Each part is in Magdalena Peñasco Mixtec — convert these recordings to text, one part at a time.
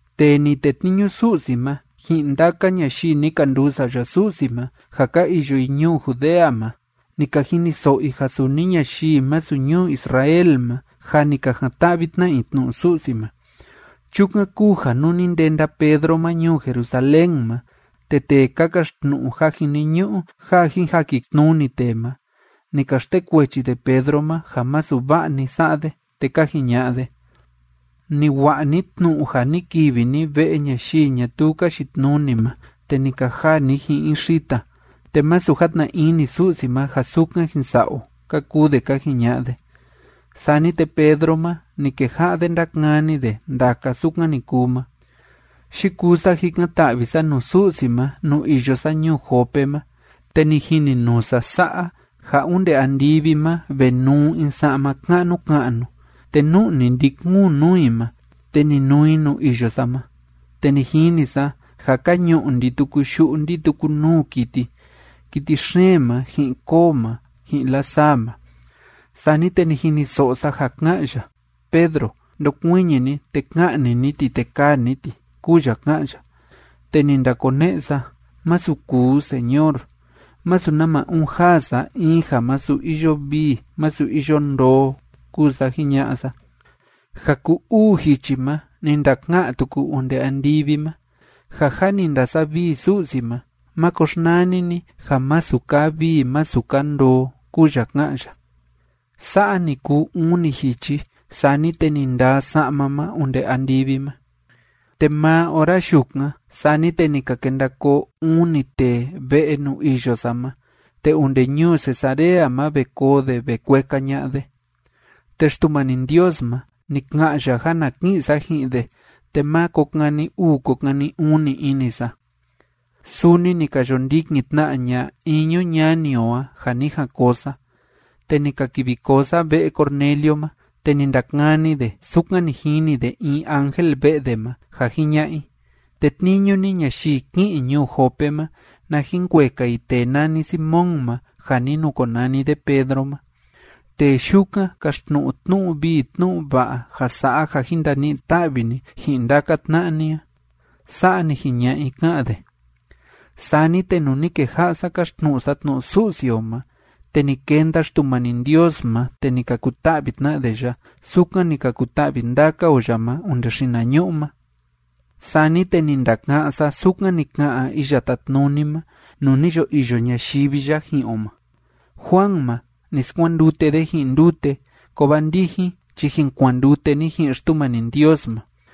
Tee ni tetniñu Su'si ma ji'in ndaka ñayii ni ka nduu sa'ya Su'si ma ja ka iyo i ñuu Judea ma, ni ka jiniso'o i ja suni ñayii masu ñuu Israel ma, jâ ni ka jan‑ta'vi tna i tnu'u Su'si ma. Chukan kúu ja nuu ni ndenda Pedro ma ñuu Jerusalén ma, te tee ka kaxtnu'u ja jiniñu'u ja jin jakitnuni tee ma, ni ka xtekuechi de Pedro ma ja masu va'a ni sa'a de, te ka jiña'a de: ―Ni wa'a ni tnu'u ja ni kivi ni ve'e ñayii ñatuu ka yitnuni ma, te ni ka jaa ni ji'in i xita, te masu játna ini Su'si ma ja sukan jin sa'a o ―ka kuu de ka jiña'a de. Sani te Pedro ma, ni keja'a de ndákani de ndaka sukan ni kuu ma: ―Yikuu sa jikan‑ta'vi sa nuu Su'si ma nuu iyo sa ñuu Jope ma, te ni jininuu sa sa'a, ja onde andivi ma ve nuu in sa'ma ka'nu ka'nu, te nu'ni ndi‑kuun nuu i ma, te ni nuu i nuu iyo sa ma. Te ni jini sa ja ka ñu'u ndi‑tuku yu'u ndi‑tuku nuu kiti: kiti xeen ma, ji'in koo ma, ji'in lasaa ma. Sani te ni jiniso'o sa ja ká'an ya: “Pedro, ndokuiñi ni, te ka'ni ni ti, te kaa ni ti”, kúu ya ká'an ya. Te ni ndakone'e sa: “¡Masu kuu, Señor! Masu nama uun jaa sa in ja masu iyo vii masu iyo ndoo”, kúu sa jiña'a sa. Ja ku‑uu jichi ma ni ndaka'an tuku onde andivi ma: “Ja jâ ni ndasavii Su'si ma máko xnani ni ja masu kaa vii masu kaa ndoo”, kúu ya ká'an ya. Sa'a ni kuu uni jichi, sani te ni ndaa sa'ma ma onde andivi ma. ’Te maa ora yukan, sani te ni ka kenda koo uni tee ve'e nuu iyo sa ma, te onde ñuu Cesarea ma ve koo de ve kueka ña'a de. Te Xtumani Ndios ma, ni ka'an ya ja na ki'in sa ji'in de, te má ko kani uu ko kani uni ini sa. Suni ni ka yo ndikin tna ña'a iñu ñani o a ja ni jan koo sa. Te ni ka kivi koo sa ve'e Cornelio ma, te ni ndakani de sukan ni jini de in ángel ve'e de ma, ja jiña'a i: “Tetniñu ni ñayii ki'in ñuu Jope ma, na jin kueka i tee nani Simón ma ja ni nukonani de Pedro ma. Tee yukan kaxtnu'u tnu'u vii tnu'u va'a ja sa'a ja jin ndani'i ta'vi ni ji'in ndaka tna'a ni a.” Sa'a ni jiña'a i, ká'an de. ’Sani te nuu ni keja'a sa káxtnu'u sa tnu'u Su'si o ma, te ni kenda Xtumani Ndios ma, te ni ka kuta'vi tna de ya, sukan ni ka kuta'vi ndaka o ya ma onde xinañu'u ma. Sani te ni ndaka'án sa sukan ni ka'an Iya Tátnuni ma nuu ni yo iyo ñayivi ya ji'in o ma: “Juan ma, ni skuandute de ji'in ndute, kovaa ndijin chi jin kuandute ni ji'in Xtumani Ndios ma.”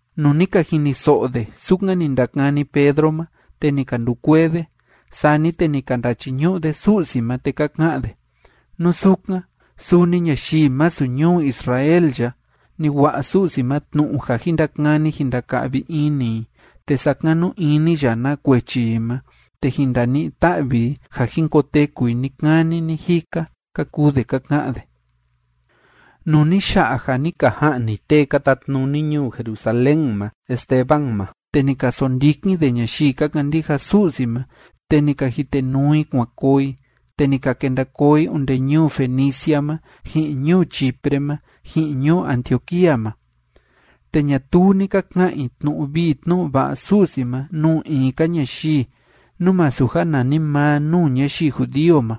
Nuu ni ka jiniso'o de sukan ni ndakani Pedro ma, te ni ka ndukuee de. Sani te ni ka ndachiñu'u de Su'si ma, te ka ka'an de: ―¡Nú sukan, suni ñayii masu ñuu Israel ya, ni wa'a Su'si ma tnu'u ja jin ndakani jin ndaka'vi ini i, te sakanu ini ya na kuechi i ma, te jin ndani'i ta'vi i ja jin koteku i ni‑kani ni‑jika! ―ka kuu de ka ka'an de. Nuu ni ya'a ja ni ka ja'ni tee ka tatnuni ñuu Jerusalén ma Esteban ma, te ni ka sondikin de ñayii ka kandija Su'si ma, te ni ka jitenuu i kuan koo i, te ni ka kenda koo i onde ñuu Fenicia ma, ji'in ñuu Chipre ma, ji'in ñuu Antioquía ma. Te ñatuu ni ka ka'an i tnu'u vii tnu'u va'a Su'si ma nuu in‑ka ñayii, nú masu ja nanimaa nuu ñayii judío ma.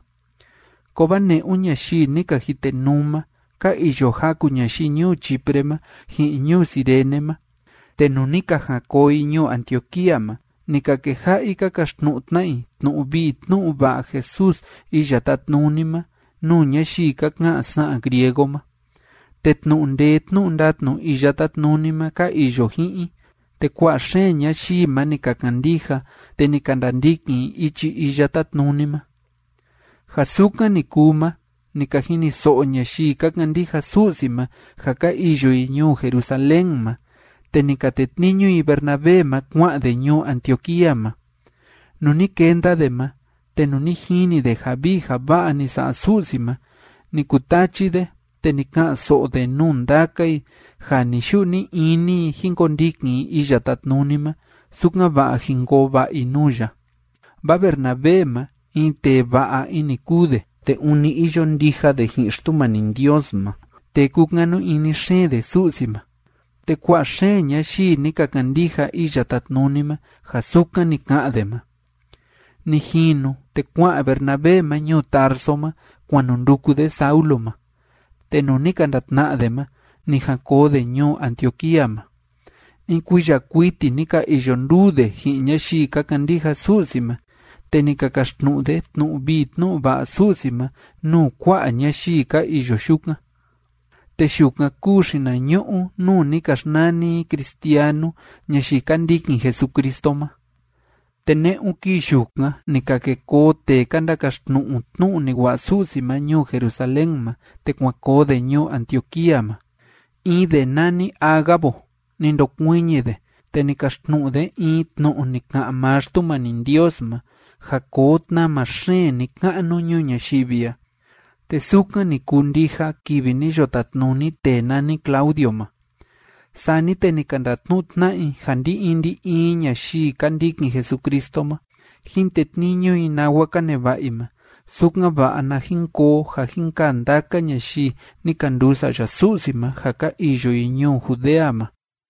Kovaa ne'un ñayii ni ka jitenuu ma ka iyo jaku ñayii ñuu Chipre ma ji'in ñuu Cirene ma, te nuu ni ka jan koo i ñuu Antioquía ma, ni ka keja'a i ka kaxtnu'u tna i tnu'u vii tnu'u va'a Jesús Iya Tátnuni ma nuu ñayii ka ka'an sa'an griego ma. Te tnu'u ndee tnu'u ndatnu Iya Tátnuni ma ka iyo ji'in i, te kua'a xeen ñayii ma ni ka kandija, te ni ka ndandikin i ichi Iya Tátnuni ma. Ja sukan ni kuu ma, ni ka jiniso'o ñayii ka kandija Su'si ma ja ka iyo i ñuu Jerusalén ma, te ni ka tetniñu i Bernabé ma kua'an de ñuu Antioquía ma. Nuu ni kenda de ma te nuu ni jini de ja vii ja va'a ni sa'a Su'si ma, ni kutachi de, te ni ka'an‑so'o de nuu ndaka i ja ni‑yu'u ni‑ini i jín kondikin i Iya Tátnuni ma, sukan‑va'a jin koo va'a i nuu ya. Vaa Bernabé ma, in tee va'a ini kúu de, te ûni iyo ndija de ji'in Xtumani Ndios ma, te kúkanu ini xeen de Su'si ma. Te kua'a xeen ñayii ni ka kandija Iya Tátnuni ma ja sukan ni ka'an de ma. Ni jinu, te kua'an Bernabé ma ñuu Tarso ma kuan nu nduku de Saulo ma. Te nuu ni ka ndatna'a de ma, ni jan koo de ñuu Antioquía ma. In kuiya kuiti ni ka iyo nduu de ji'in ñayii ka kandija Su'si ma, te ni ka kaxtnu'u de tnu'u vii tnu'u va'a Su'si ma nuu kua'a ñayii ka iyo yukan. Te yukan kúu xinañu'u nuu ni ka xnani i cristianu ñayii ka ndikin Jesucristo ma. Te ne'un kii yukan ni ka ke koo tee ka ndakaxtnu'u tnu'u ni wa'a Su'si ma ñuu Jerusalén ma, te kuan koo de ñuu Antioquía ma. In de nani Ágabo, ni ndokuiñi de, te ni kaxtnu'u de in tnu'u ni ka'an maa Xtumani Ndios ma, ja koo tnama xeen ni‑ka'nu ñuu ñayivi a. Te sukan ni kuu ndija kivi ni yo tatnuni tee nani Claudio ma. Sani te ni ka ndatnu'u tna'a i ja ndi‑in ndi‑in ñayii ka ndikin Jesucristo ma, jín tetniñu i nawa ka neva'a i ma, sukan‑va'a na jin koo ja jin kaa ndaka ñayii ni ka nduu sa'ya Su'si ma ja ka iyo i ñuu Judea ma.